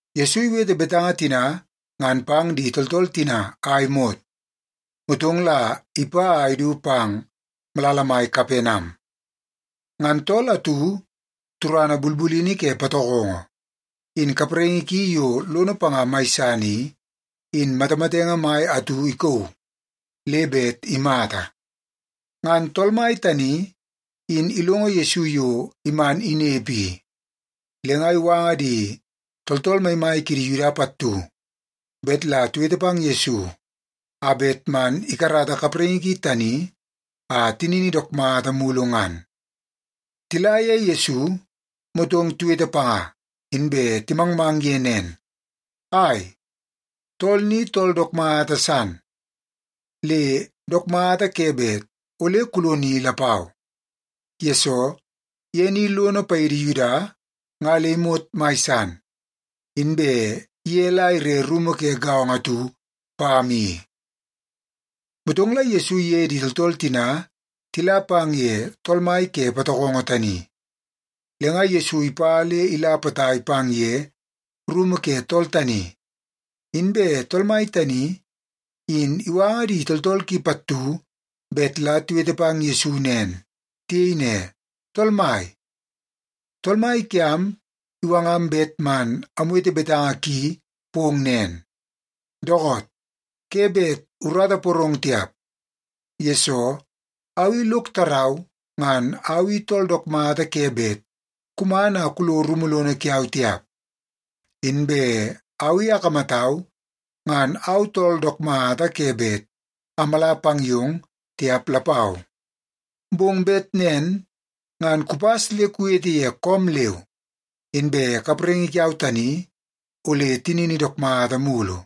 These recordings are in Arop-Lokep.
Yesu iwete betanga tina ngan pang di tooltool tina a imot, motong la ipa a idu pang malala mai Kapenam. Ngan tool atu turana bulbulini ke patokongo, in kapraingi ki yo lono panga mai san i, in matamatenge mai atu ikauu le bet imata. Ngan tool mai tani in ilongo Yesu yo man inepe i, le nga iwanga di tooltool maimai kidi Yuda pattu bet la tiwete pang Yesu a bet man ikarata kapraingi ki tani a tinini dook mata mulu ngan. Tila ye Yesu, motong tiwete panga, inbe timangmang ye nen, “Ai, tool ni tool dook mata san, le dook mata ke bet ole kuloni lapau, yesoo ye ni lono paidi Yuda nga le imot mai san, inbe ye la ire rumu ke gaongo atu pam i.” Motong la Yesu iye di tooltool tina tila pang ye tool mai ke patokongo tani. Le nga Yesu ipa le ila potai pang ye rumu ke tool tani, inbe tool mai tani, in iwanga di tooltool ki pattu bet la tiwete pang Yesu nen. Tiyei ne, “Tool Mai, tool mai kiam iwangam bet man amwete betanga ki pong nen, ‘Dookoot, ke bet urata iporong tiap, yesoo au i lok tarau ngan au i tool dook mata ke bet kuman a kulo rumu lono kiau tiap. Inbe au i akamatau ngan au tool dook mata ke bet amala pang yong tiap lapau. Bong bet nen ngan kupas le kuwete ye koom leu, inbe kapraingi kiau tani ole tinini dook mata mulu.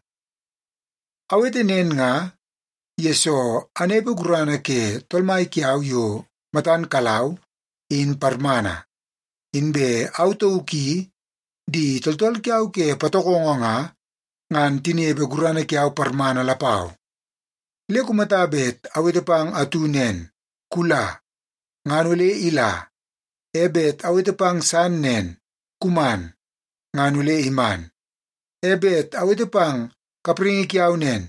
Awete nen nga, yesoo anepe gurana ke tool mai kiau yo matan kalau, in parmana. Inbe au tauk i di tooltool kiau ke patokongo nga, ngan tinepe gurana kiau parmana lapau. Le kumata bet awete pang atu nen, “Kula,” ngan ole ila. E bet awete pang san nen, “Kuman,” ngan ole iman. E bet awete pang kapraingi kiau nen,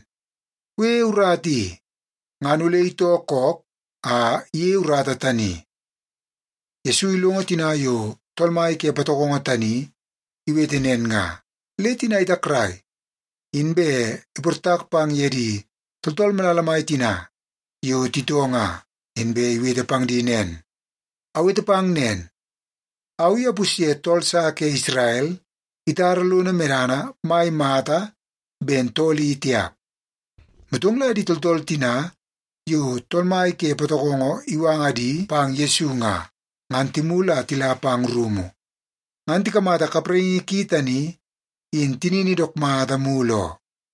“Kuyeie urata i,” ngan ole itoo kook a iyeie urata tani.’” Yesu ilongo tina yo tool mai ke patokongo tani iwete nen nga, le tina itakrai, inbe iportak pang ye di tooltool malala mai tina yo titoo nga, inbe iwete pang di nen, “Awete pang nen, au i apusye tool sa ke Isrel itara lono medana mai mata ben tool i tiap.” Motong la di tooltool tina yo tool mai ke patokongo iwanga di pang Yesu nga, ngan timulu a tila pang rumu ngan tikamata kapraingi ki tani in tinini dook mata mulu oo.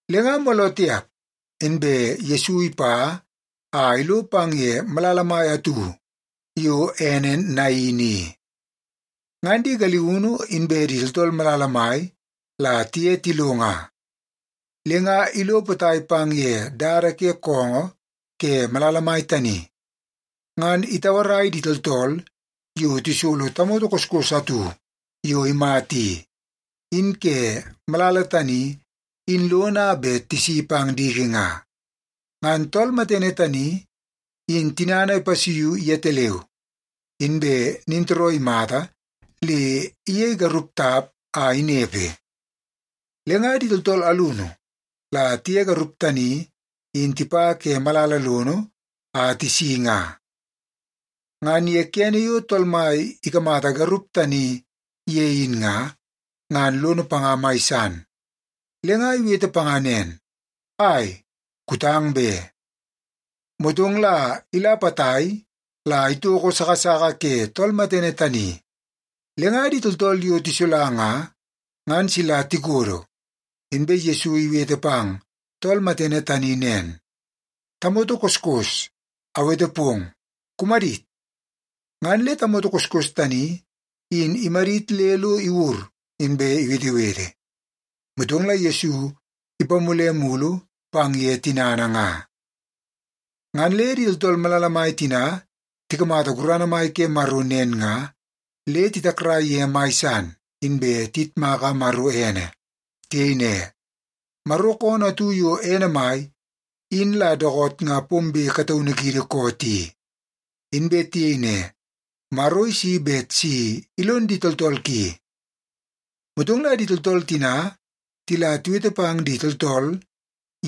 Le nga mooloo tiap inbe Yesu ipa a ilo pang ye malala mai atu yo ene Nain i. Ngan di galiunu inbe di tooltool malala mai la tiye tilo nga. Le nga ilo potai pang ye dada ke koongoo ke malala mai tani, ngan itauarai di tooltool yo tisolo tamoto koskos atu yo imata i, in ke malala tani in lono a bet tisi pang diki nga. Ngan tool matene tani, in tinana ipasuiu yetaleu, inbe nintooroo imata le iyei garup tap a inepe. Le nga di tooltool alunu la tiye garup tani in tipa ke malala lono a tisi nga. Ngan ye kene yo Tool Mai ikamata garup tani ye in nga, ngan lono panga mai san. Le nga iwete panga nen, “Ai, kutang be.” Motong la ila potai la itoko sasaka ke tool matene tani, le nga di tooltool yo tisola nga, ngan sila tikodo. Inbe Yesu iwete pang tool matene tani nen, “Tamoto koskos, awete pong, kumadit!” Ngan le tamoto koskos tani in imadit le lo iwur, inbe iwetewete. Motong la Yesu ipamule mulu pang ye tinana nga. Ngan le di tooltool malala mai tina tikamata gurana mai ke Maro nen nga, le titakrai ye mai san, inbe tiyitmaka Maro ene. Tiyei ne, “Maro koonoo atu yo ene mai in la dookoot nga pombe kataunu kiidi koot i.” Inbe tiyei ne, “Maro isi bet si ilon di tooltool ki.” Motong la di tooltool tina, tila tiwete pang di tooltool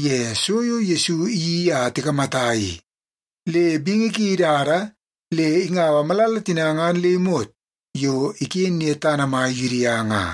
ye so yo Yesu iyeii a tikamata i, le bingi ki idada le ingau malala tina ngan le imot yo iken ye tana mai Yudia nga.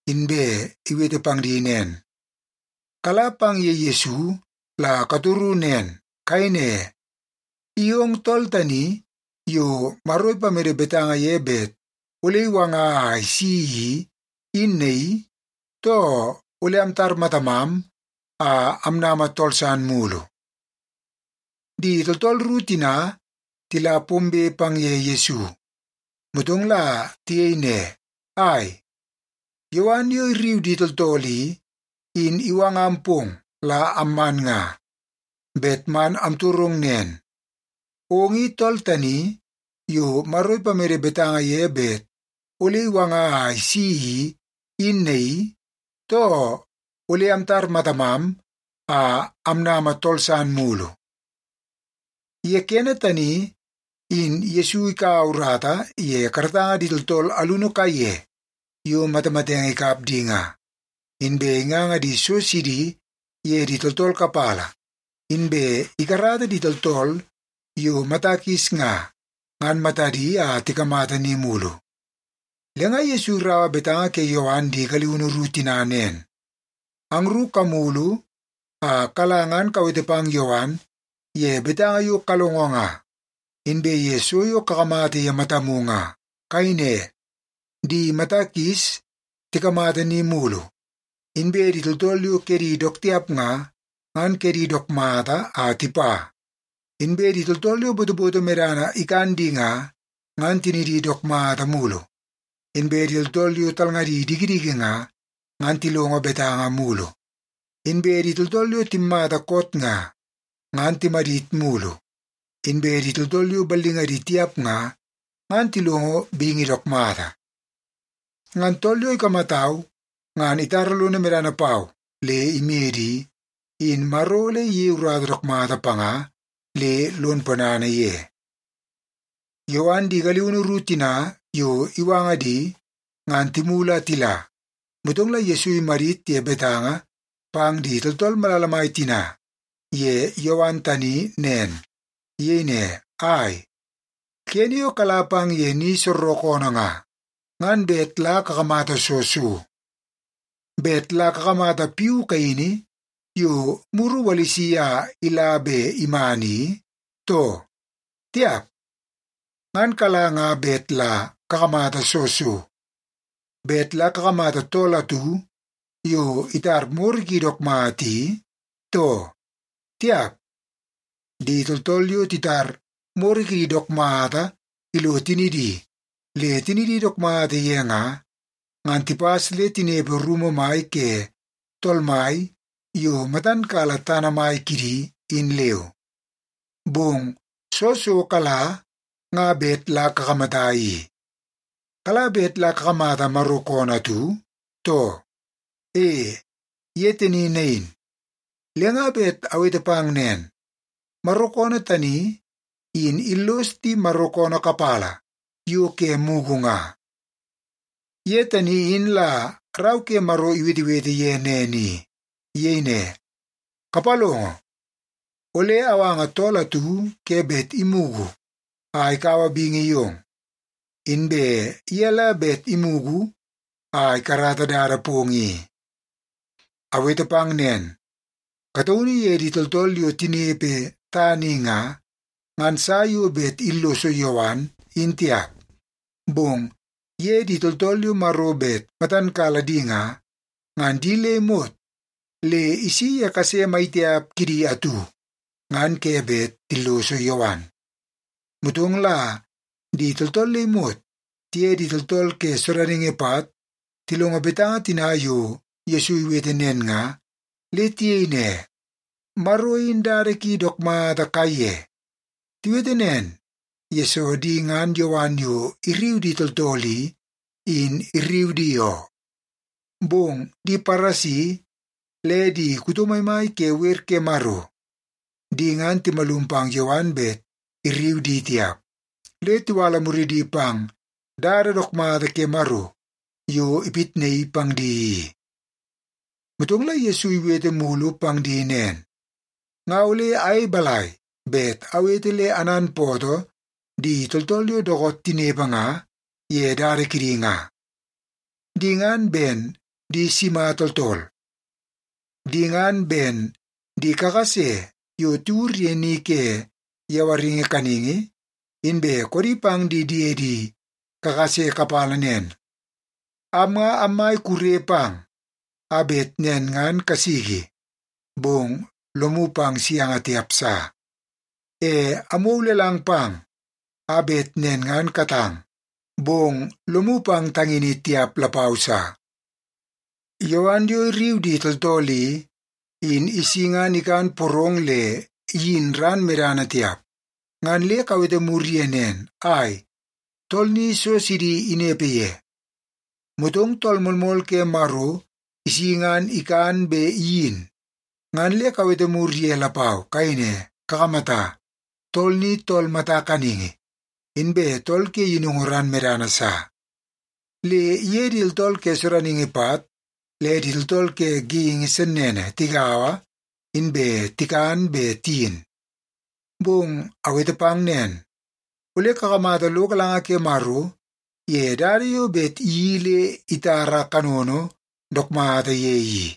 inbe iwete pang di nen, “Kala pang ye Yesu la katoru nen. Kayei ne, ‘I ong tool tani yo Maro ipamede betanga ye bet ole iwanga a isi i, in naii, too ole amtar matamam a amnama tool san mulu?’” Di tooltool ru tina tila pombe pang ye Yesu, motong la tiyei ne, “Ai, Yowan yo irriu di tooltool i, in iwangam pong la amman nga. Bet man amtorong nen, ong i tool tani yo Maro ipamede betanga ye bet ole iwanga a isi i, in naii, too ole amtar matamam a amnama tool san mulu?” Ye kene tani, in Yesu ikaua urata ye karatanga di tooltool alunu kaiye yo matamatenge ikap di nga. Inbe inganga so sidi ye di tooltool kapala, inbe ikarata di tooltool yo mata kis nga, ngan matadi a tikamata ni mulu. Le nga Yesu iraua betanga ke Yowan di galiunu ru tina nen, “Angru kamulu a kala ngan kawete pang Yowan ye betanga yo kalongo nga, inbe ye so yo kakamata ye matamu nga. Kayei ne, ‘Di mata kis tikamata ni mulu; inbe di tooltool yo kedi dook tiap nga, ngan kedi dook mata a tipa; inbe di tooltool yo botoboto medana ikan di nga, ngan tinidi dook mata mulu; inbe di tooltool yo talngadi dikidiki nga, ngan tilongo betanga mulu; inbe di tooltool yo timmata koot nga, ngan timadit mulu; inbe di tooltool yo ballingadi tiap nga, ngan tilongo bingi dook mata.’ Ngan tool yo ikamatau ngan itara lono medana pau le imede i, in Maro ole iyei urata dook mata panga le lon ponana ye.” Yowan di galiunu ru tina yo iwanga di, ngan timulu a tila, motong la Yesu imadit ye betanga pang di tooltool malala mai tina ye Yowan tani nen. Iyei ne, “Ai, kene yo kala pang ye ni soorookoonoo nga, ngan bet la kakamata soo so? Bet la kakamata piu kaini yo muru iwalisi a ila be iman i, too? Tiap. Ngan kala nga bet la kakamata soo so? Bet la kakamata tool atu yo itar moro ki dook mata i, too? Tiap. Di tooltool yo titar moro kidi dook mata ilo tinidi le tinidi dook mata ye nga, ngan tipas le tinepe rumu mai ke tool mai yo matan kala tana mai kidi, in leu. Bong soo so kala nga bet la kakamata i? Kala bet la kakamata Maro koonoo atu, too? E, ye tani nain. Le nga bet awete pang nen, Maro koonoo tani in illos di Maro koonoo kapala yo ke mugu nga. Ye tani in la Rau ke Maro iwetewete ye nen i. Iyei ne, ‘Kapalongo! Ole awanga tool atu ke bet imugu a ikaua bingi yong. Inbe ye la bet imugu a ikarata dada pong i.’ Awete pang nen, kataunu ye di tooltool yo tinepe tana i nga, ngan sa yo bet illoso Yowan, in tiap. Bong ye di tooltool yo Maro bet matan kala di nga, ngan di le imot le isi ye kase maitiap kidi atu, ngan ke bet tilloso Yowan.” Motong la di tooltool le imot tiye di tooltool ke sodaningi pat tilongo betanga tina yo Yesu iwete nen nga, le tiyei ne, “Maro in dada ki dook mata kaiye.” Tiwete nen, yesoo di ngan Yowan yo irriu di tooltool i, in irriu di oo. Bong di Paresi le di kuto maimai ke wer ke Maro, di ngan timalum pang Yowan bet irriu di tiap. Le tiwala muridi pang dada dook mata ke Maro yo ipitnaii pang di i. Motong la Yesu iwete mulu pang di nen, “Nga ole ayei balai bet awete le ananpootoo di tooltool yo dookoot tinepe nga ye dada kidi nga? Di nga ben di sima tooltool? Di ngan ben di kakase yo tiwur ye ni ke yawaringi kaningi, inbe koodi pang di diedi kakase kapala nen, ‘Am nga ammai kure pang a bet nen ngan kasiki, bong lomu pang sianga tiap sa. E amwou lelang pang a bet nen ngan katang, bong lomu pang tangini tiap lapau sa.’ Yowan yo irriu di tooltool i, in isi ngan ikan porong le iyin ran medana tiap. Ngan le kawete mur ye nen, ‘Ai, tool ni so sidi inepe ye.’ Motong Tool Moolmool ke Maro isi ngan ikan be iyin, ngan le kawete mur ye lapau. Kayei ne, ‘Kakamata, tool ni tool mata kaningi inbe tool ke yinungu ran medana sa. Le iye di tooltool ke sodaningi pat le di tooltool ke geingi sennene tigaua, inbe tikan be tiyin.’ Bong awete pang nen, ole kakamata lo galanga ke Maro ye dada yo bet iyeii le itara kanono dook mata ye i.”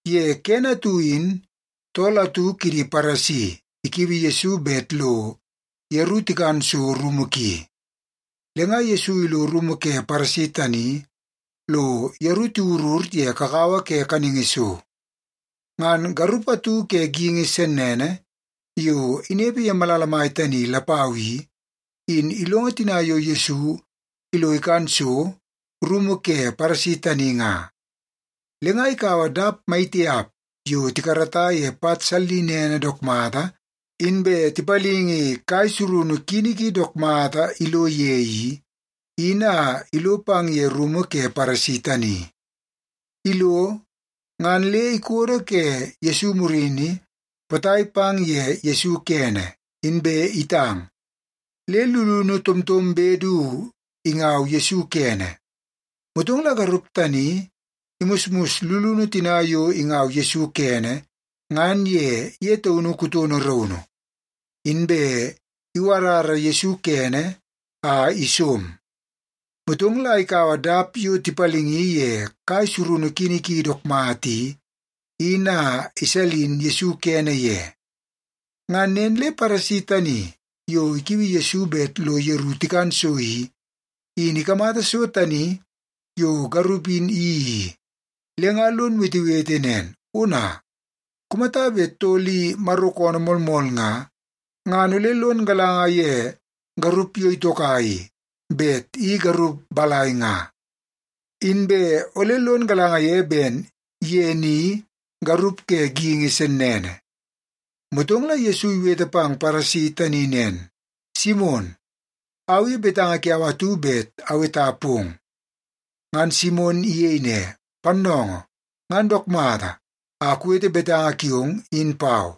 Ye kene atu in tool atu kidi Paresi ikiui Yesu bet lo yeru tikan so rumu ki. Le nga Yesu ilo rumu ke Paresi tani lo yeru tiwurur ye kakawa ke kaningi so. Ngan garup atu ke geingi sennene yo inepe ye malala mai tani lapau i, in ilongo tina yo Yesu ilo ikan so rumu ke Paresi tani nga. Le nga ikaua dap maitiap yo tikarata ye pat sallinene dook mata inbe tipalingi kai surunu kini ki dook mata ilo ye i, in a ilo pang ye rumu ke Paresi tani. Ilo, ngan le ikodo ke Yesu murini potai pang ye Yesu kene, inbe itang, le lulunu tomtombe du ingau Yesu kene. Motong la garup tani imusmus lulunu tina yo ingau Yesu kene, ngan ye ye taunu kutono raunu, inbe iwarara Yesu kene a isom. Motong la ikaua dap yo tipalingi ye kai surunu kini ki dook mata i, in a isalin Yesu kene ye. Ngan nen le Paresi tani yo ikiui Yesu bet lo yeru tikan so i, in ikamata so tani yo garup in iyeii i, le nga lon wetewete nen, “Ona, kumata bet tool i Maro koonoo moolmool nga, ngan ole lon galanga ye garup yo itoka i, bet i garup balai nga. Inbe ole lon galanga ye ben ye ni garup ke geingi sennene.” Motong la Yesu iwete pang Paresi tani nen, “Simon, au i betanga kiau atu bet aweta pong.” Ngan Simon iyei ne, “Pannoongoo, ngan dook mata, a kuwete betanga kiong in pau.”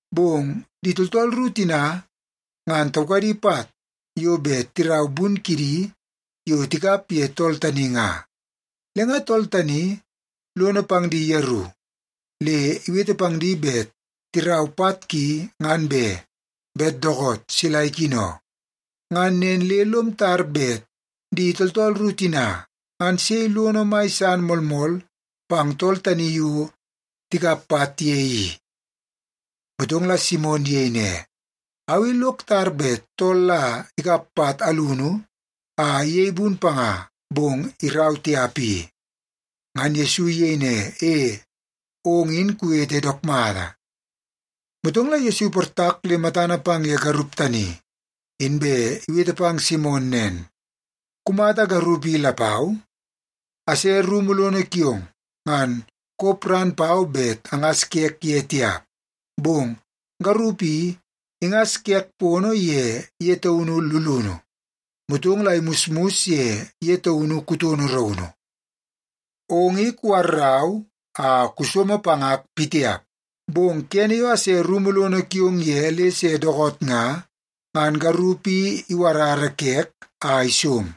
Bong di tooltool ru tina ngan taukadi pat yo bet tirau bun kidi yo tikap ye tool tani nga. Le nga tool tani lono pang di yeru, le iwete pang di bet tirau pat ki ngan be, bet dookoot sila ikino. Ngan nen le lom tar bet di tooltool ru tina, ngan sei lono mai san moolmool pang tool tani yo tikap pat ye i?” Motong la Simon iyei ne, “Au i lok tar bet tool la ikap pat alunu a iyei bun panga bong irau tiap i.” Ngan Yesu iyei ne, “E, ong in kuwete dook mata.” Motong la Yesu iportak le matana pang ye garup tani, inbe iwete pang Simon nen, “Kumata garup i lapau? Ase rumu lono kiong, ngan kop ran pau bet angas kek ye tiap. Bong garup i ingas kek pono ye ye taunu lulunu, motong la imusmus ye ye taunu kutono raunu. Ong i kuwarrau a kusomo pangak pitiap. Bong kene yo ase rumu lono kiong ye le se dookoot nga, ngan garup i iwarara kek a isom.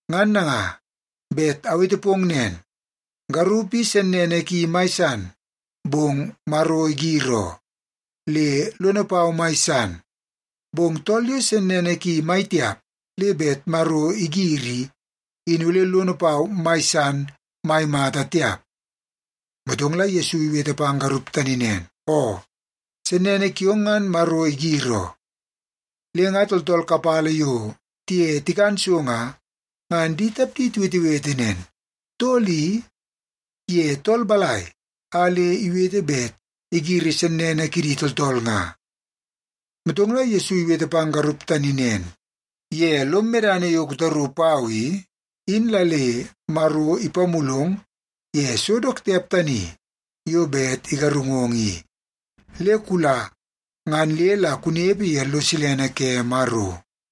Ngan nanga, bet awete pong nen, garup i sennene ki mai san, bong Maro igir oo, le lono pau mai san. Bong tool yo sennene ki mai tiap le bet Maro igiri i, in ole lono pau mai san mai mata tiap.” Motong la Yesu iwete pang garup tani nen, “Oo, sennene kiong ngan Maro igir oo.” Le nga tooltool kapala yo tiye tikan so nga, ngan di tapdi tiwetewete nen, “Tool i, ye tool balai a le iwete bet igiri sennene kidi tooltool nga?” Motong la Yesu iwete pang garup tani nen, “Ye lom medana yo kutaru pau i, in la le Maro ipamulong ye so dook tiap tani yo bet igarungong i. Le kula ngan le la kunepe ye lo silene ke Maro.”